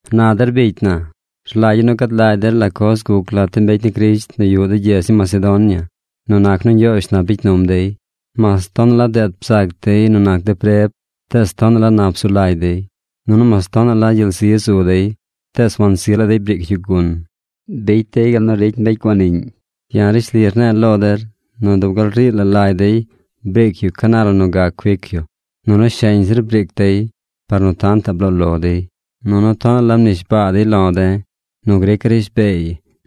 Na der bicy na, rlagya̱ nu gad lagy der la coz guc lat de mbecy ni Crisht nu yuꞌ de gyedz ni Macedonia nu nac nu Ñgyoozh nap bicy num dey. Mas tonaꞌ la deet bzac dey nu nac de preb, tees tonaꞌ la nap zu lagy dey. Nunu mas tonaꞌ la gyel zi zu dey, tees wansi laa dey briic yu gun. Bicy dey gal nu ricy mbecy guaniꞌñ. Ya̱ rishli rne̱e̱ lo der nu dub gal rii la lagy dey briic yu ca na la nu gac cuic yu. Nunu sheñ zir briic dey par nu tantaꞌ bloo lo dey. Nunu tonaꞌ la mnishbaa dey lo de̱ nu grica̱ rishbeey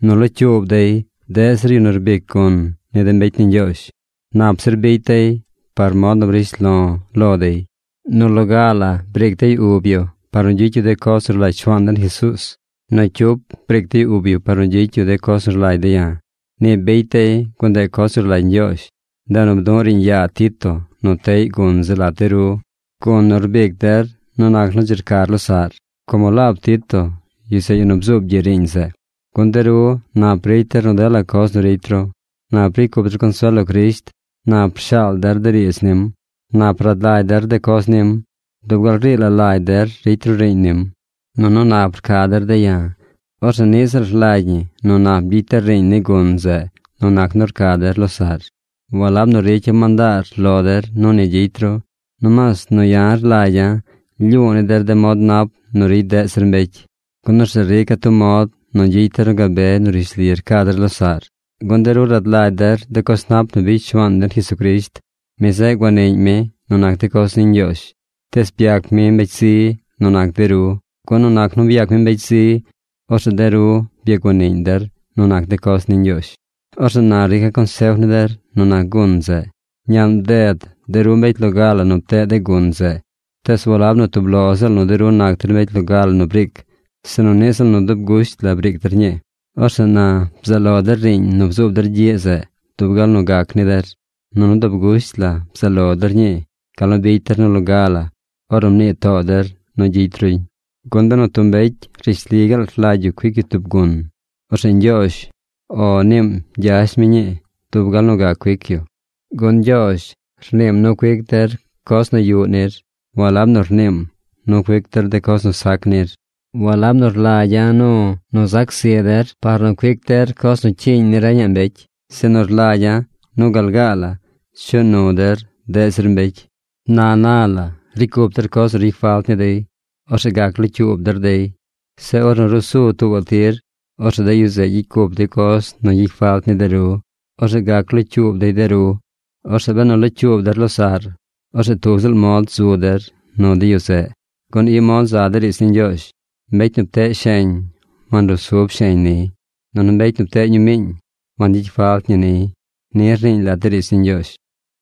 nu locyuub dey deꞌ zir yu nu rbic gun ni de mbecy ni Ñgyoozh. Nap zir bicy dey par mod nu brish lo̱ lo dey. Nu loga la briic dey ub yu par nu gyicy yu de coz nu rlagy Shuaan den Jesuuz. Nu cyup briic dey ub yu par nu gyicy yu de coz nu rlagy de̱ ya̱. Ni bicy dey gun ndeꞌ coz nu rlagy Ñgyoozh. Ndeꞌ nu bdu̱ꞌ de̱ riiñ yaa Tito nu teꞌy gun zeꞌ lat de ru, gun nu rbic der nu nac nu dzi rcar losaꞌr, como laab Tito, yu zeꞌ yu nu bzuub gyiꞌ riiñ zeꞌ. Gun de ru nap ricy der nu dela coz nu ricy ru. Nap ricy cup der consuel lo Crisht. Nap rshaal der de riidz nim. Nap rad lagy der de coz nim. Dub gal rii la lagy der ricy ru riiñ nim. Nunu nap rca der de̱ ya̱. Orzeꞌ niꞌ ziꞌl rlagy ñi nu nap gyicy der riiñ ni gun zeꞌ nu nac nu rca der losaꞌr. Walab nu ricya̱ mandaar lo der nu ni gyicy ru. Nomaas nu ya̱ rlagya̱ rlyu̱u̱ ni der de mod nap nu ricy deꞌ zir mbecy, gun orzeꞌ rica̱ tub mod nu gyicy der nu gabe nu rishli rca der losaꞌr. Gun de ru rad lagy der de coz nap nu bicy Shuaan den Jesucrisht. Mi zeꞌ guaniꞌñ mi nu nac de coz ni Ñgyoozh, tees byac mi mbecy zi nu nac de ru. Gun nu nac nu byac mi mbecy zi, orzeꞌ de ru byaguaniꞌñ der nu nac de coz ni Ñgyoozh. Orzeꞌ na rica̱ consef ni der nu nac gun zeꞌ. Ñaꞌn bded de ru mbecy loga la nu pteꞌ de gun zeꞌ. Tees walab nu tub lo ziꞌl nu de ru nac der mbecy loga nu briic, sinu niꞌ ziꞌl nu dub gusht la briic der ñii. Orzeꞌ na bzaꞌ lo der riiñ nu bzuub der gyiꞌ zeꞌ dub gal nu gac ni der. Nunu dub gusht la bzaꞌ lo der ñii gal nu bicy der nu loga la ornu mnii too der nu gyicy ruñ. Gun benu tub mbecy rishli gaal rlagy yu cuic yu tub gun, orzeꞌ Ñgyoozh “O” niim gyash mi ñii dub gal nu gac cuic yu. Gun Ñgyoozh rniim nu cuic der coz nu yuꞌ nir, walab nu rniim nu cuic der de coz nu sac nir. Walab nu rlagya̱ nu nu zac zi der par nu cuic der coz nu cyiiñ ni reñaꞌ mbecy. Sinu rlagya̱ nu gal gaa la chuꞌ nu der deꞌ zir mbecy. Na na la ricy cup der coz nu ricy falt ni dey. Orzeꞌ gac locyuub der dey. Zeꞌ ornu ruu su tuubaꞌ tir, orzeꞌ de yu zeꞌ gyicy cup dey coz nu gyicy falt ni de ru. Orzeꞌ gac locyuub dey de ru. Orzeꞌ benu locyuub der losaꞌr, orzeꞌ tub ziꞌl mod zu der nu de yu zeꞌ. Gun i mod za de riidz ni Ñgyoozh: Mbecy nu pteꞌ sheñ, wanrusub sheñ niy. Nunu mbecy nu pteꞌ ñumiiñ, wangyicy falt ñi niy. Ni rniiñ lat de riidz ni Ñgyoozh.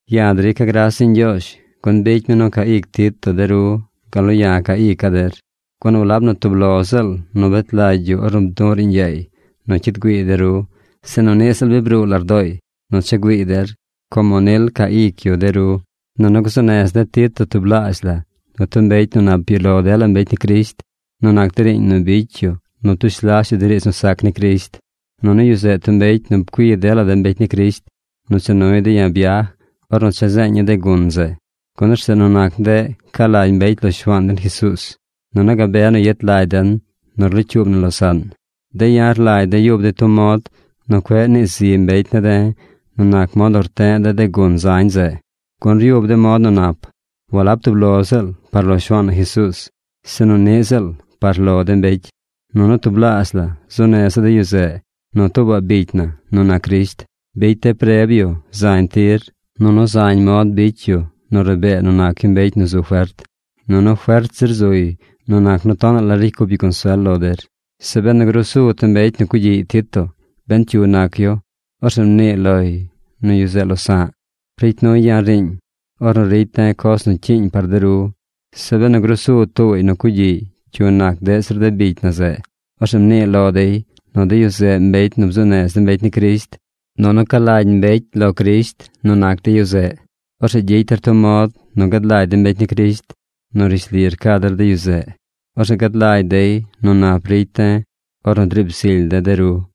Ya̱ drica̱ gras ni Ñgyoozh, gun bicy mi nu ca ic Tito de ru gal nu ya̱ ca ica̱ der. Gun walab nu tub lo ziꞌl nu bet lagy yu ornu bdu̱ꞌ riiñ yaay nu cyid güiiy de ru, sinu niꞌ ziꞌl bi bruu lardooy nu cha güiiy der, como nil ca ic yu de ru. Nunu gzuu nez de̱ Tito tublaazh la nu tub mbecy nu nap yuꞌ lo dela mbecy ni Crisht nu nac de riiñ nu bicy yu nu ptush las yu de riidz nu sac ni Crisht. Nunu yu zeꞌ tub mbecy nu pcui dela de mbecy ni Crisht nu cha nuy de̱ ya̱ byaj ornu cha zeeña̱ de gun zeꞌ. Gun orzeꞌ nu nac ndeꞌ ca lagy mbecy lo Shuaan den Jesuuz, nunu gabe nu yet lagy den nu rlocyuub na losaꞌn. De̱ ya̱ rlagy de̱ yub de̱ tub mod nu cueꞌ nii zi mbecy ne̱ de̱ nu nac mod nu rte̱ꞌ de̱ de gun zañ zeꞌ. Gun ryub de̱ mod nu nap, walab tub lo ziꞌl par lo Shuaan na Jesuuz, sinu niꞌ ziꞌl par lo de mbecy. Nunu tublaazh la zuu neza̱ de yu zeꞌ nu tuubaꞌ bicy na nu nac Crisht. Bicy de̱ preb yu zañ tir, nunu zañ mod bicy yu nu rabee nu nac yu mbecy nu zu fert. Nunu fert zir zuy nu nac nu tonaꞌ la ricy cup yu consuel lo der. Zeꞌ benu grusu tub mbecy nu cugyiꞌ Tito, ben cyu nac yu, orzeꞌ mnii loy nu yu zeꞌ losa̱ꞌ. Ricy nuy ya̱ riiñ ornu ricy de̱ coz nu cyiiñ par de ru. Zeꞌ benu grusu tuubaꞌy nu cugyiꞌ cyu nac deꞌ zir de bicy na zeꞌ, orzeꞌ mnii lo dey nu de yu zeꞌ mbecy nu bzuu nez de mbecy ni Crisht. Nunu ca lagy mbecy lo Crisht nu nac de yu zeꞌ. Orzeꞌ gyicy der tub mod nu gad lagy de mbecy ni Crisht nu rishli rca der de yu zeꞌ. Orzeꞌ gad lagy dey nu nap ricy de̱ ornu driib zily de̱ de ru.